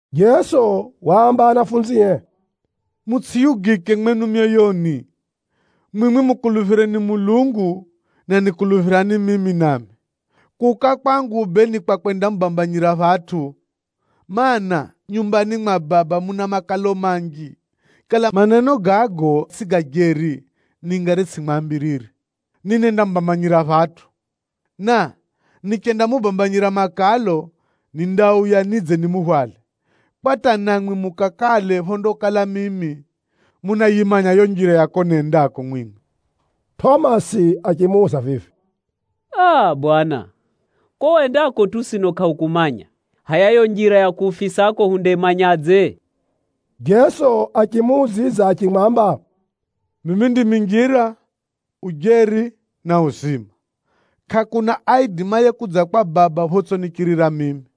Jeso waamba anafunzie, “Mutsʼiyugike mwenu myoyoni. Mwimwi mukuluphireni Mulungu, na nikuluphirani mimi nami. Kuuka kwangu bee ni kwa kwendamubambanyira phatʼu, mana, nyumbani mwa Baba muna makalo manji. Kala maneno gago tsʼi ga jeri, ningari tsʼimwambirire ninendamubambanyira phatʼu. Na nichendamubambanyira makalo, nindauya nidze nimuhwale, kwa hata namwi mukakale phondakala mimi. Munayimanya yo njira ya ko nendako mwimwi.” Tʼomasi achimuuza vivi, “Aa! Bwana, ko wendako tu sino kʼahukumanya. Hʼaya yo njira ya kuhufisako hundayimanyadze?” Jeso achimuudzidza achimwamba, “Mimi ndimi njira, ujeri na uzima. Kʼakuna aidimaye kudza kwa Baba photsʼinichirira mimi.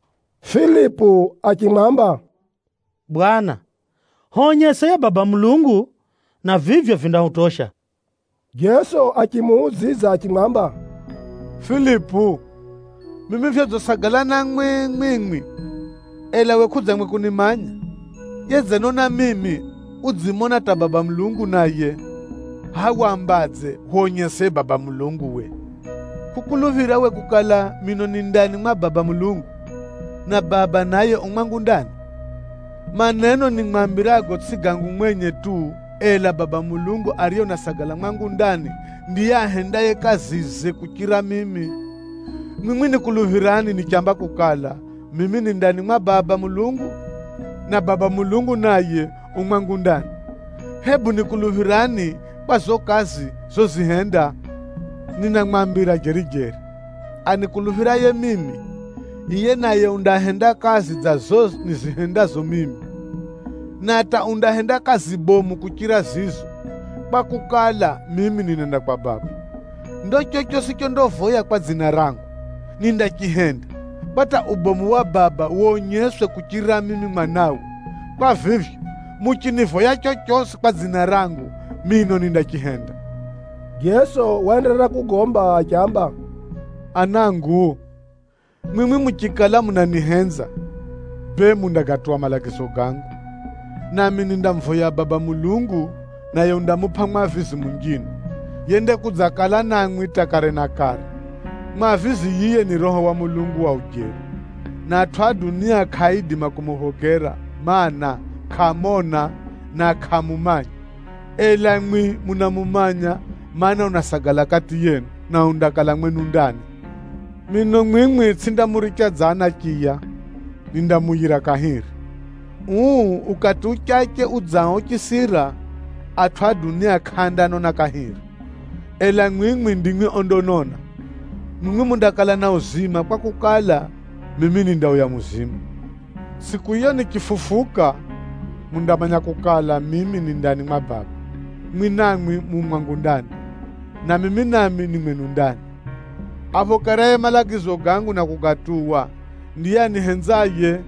Filipu achimwamba, “Bwana, hwonyese yiye Baba Mulungu, na vivyo vindahutosha.” Jeso achimuudzidza achimwamba, “Filipu, mimi vyodzisagala namwi mwimwi, ela we kʼudzangwe kunimanya? Yedzenona mimi, udzimona hata Baba Mulungu naye. Hʼa wambadze, ‘Hwonyese yiye Baba Mulungu we?’ Kʼukuluphira we kukala, mino ni ndani mwa Baba Mulungu, na Baba Mulungu naye u mwangu ndani? Maneno nimwambirago tsʼi gangu mwenye tu, ela Baba Mulungu ariye unasagala mwangu ndani ndiye ahendaye kazize kuchirira mimi. Mwimwi nikuluphirani nichamba kukala, mimi ni ndani mwa Baba Mulungu, na Baba Mulungu naye u mwangu ndani, hebu nikuluphirani kwa zo kazi zozihenda. “Ninamwambira jeri-jeri, anikuluphiraye mimi, yiye naye undahenda kazi dza zo nizihendazo mimi, na hata undahenda kazi bomu kuchira zizo, kwakukala, mimi ninenda kwa Baba. Ndo chochosi chondavoya kwa dzina rangu, nindachihenda, kwa hata ubomu wa Baba wonyeswe kuchirira mimi Mwanawe. Kwa vivyo, muchinivoya chochosi kwa dzina rangu, mino nindachihenda.” Jeso waenderera kugomba achiamba, “Anangu, mwimwi muchikala munanihenza, bee mundagatuwa malagizo gangu. Nami nindamuvoya Baba Mulungu, naye undamupʼa Mwavizi munjine, yendakudzakala namwi hata kare na kare. Mwavizi yiye ni Roho wa Mulungu wa ujeri, na atʼu a dunia kʼaaidima kumuphokera, mana, kʼaamona, na kʼaamumanya. Ela mwi munamumanya, mana, unasagala kati yenu, na undakala mwenu ndani. “Mino mwimwi tsʼindamuricha dza anachiya, nindamuuyira kahiri. Uu ukati uchache udzao uchisira, atʼu a dunia kʼaandanona kahiri, ela mwimwi ndimwi ondanona. Mwimwi mundakala na uzima kwakukala, mimi nindauya muzima. Tsʼiku yiyo nichifufuka, mundamanya kukala, mimi ni ndani mwa Baba, mwi namwi mu mwangu ndani, na mimi nami ni mwenu ndani. “Aphokeraye malagizo gangu na kugatuwa, ndiye anihenzaye.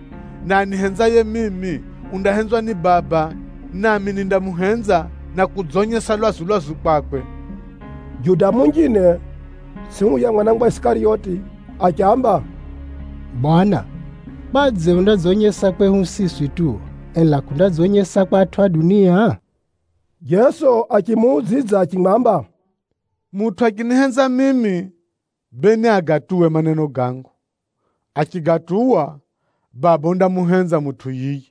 Na anihenzaye mimi, undahenzwa ni Baba, nami nindamuhenza na kudzonyesa lwazu-lwazu kwakwe.” Juda munjine (tsʼi huya mwana wa Isikariyoti) achiamba, “Bwana, kwadze undadzonyesa kwehu siswi tu, ela kʼundadzonyesa kwa atʼu a dunia?” Jeso achimuudzidza achimwamba, “Mutʼu achinihenza mimi, bee niagatuwe maneno gangu. Achigatuwa, Baba undamuhenza mutʼu yiye,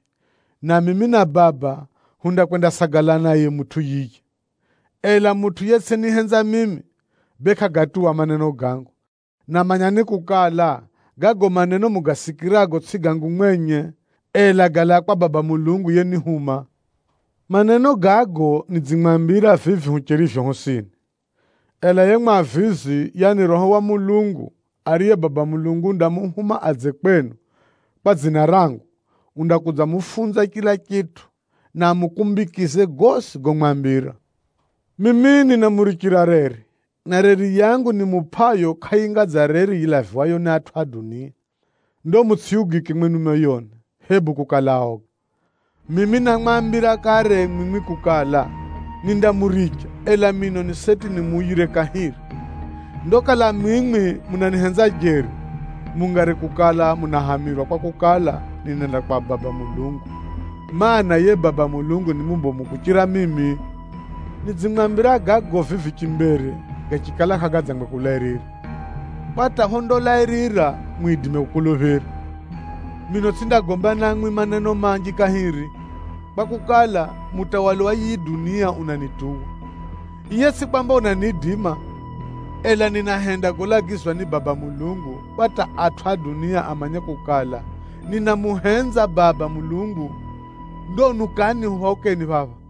na mimi na Baba, hundakwendasagala naye mutʼu yiye. Ela mutʼu yetsʼinihenza mimi, bee kʼagatuwa maneno gangu. Na manyani kukala, gago maneno mugasikirago tsʼi gangu mwenye, ela galaa kwa Baba Mulungu yenihuma. “Maneno gago nidzimwambira vivi hucherivyo hosini, ela yiye Mwavizi, yaani Roho wa Mulungu, ariye Baba Mulungu undamuhuma adze kwenu kwa dzina rangu, undakudzamufunza chila chitʼu, na amukumbikize gosi gomwambira. “Mimi ninamurichira reri, na reri yangu nimupʼayo kʼayinga dza reri yilaviwayo ni atʼu a dunia. Ndo mutsʼiyugike mwenu myoyoni, hebu kukala aoga. Mimi námwambira kare mwimwi kukala, nindamuricha, ela mino ni seti nimuuyire kahiri! Ndo kala mwimwi munanihenza jeri, mungari kukala munahamirwa kwakukala, ninenda kwa Baba Mulungu, mana, yiye Baba Mulungu ni mubomu kuchira mimi. Nidzimwambira gago vivi chimbere gachikala kʼagadzangwe kulairira, kwa hata phondalairira mwidime kukuluphira. Mino tsʼindagomba namwi maneno manji kahiri, kwakukala, mutawali wa yiyi dunia unanituwa. Yiye tsʼi kwamba unaniidima, ela ninahenda golagizwa ni Baba Mulungu, kwa hata atʼu a dunia amanye kukala, ninamuhenza Baba Mulungu. “Ndo unukani huphaukeni phapha!”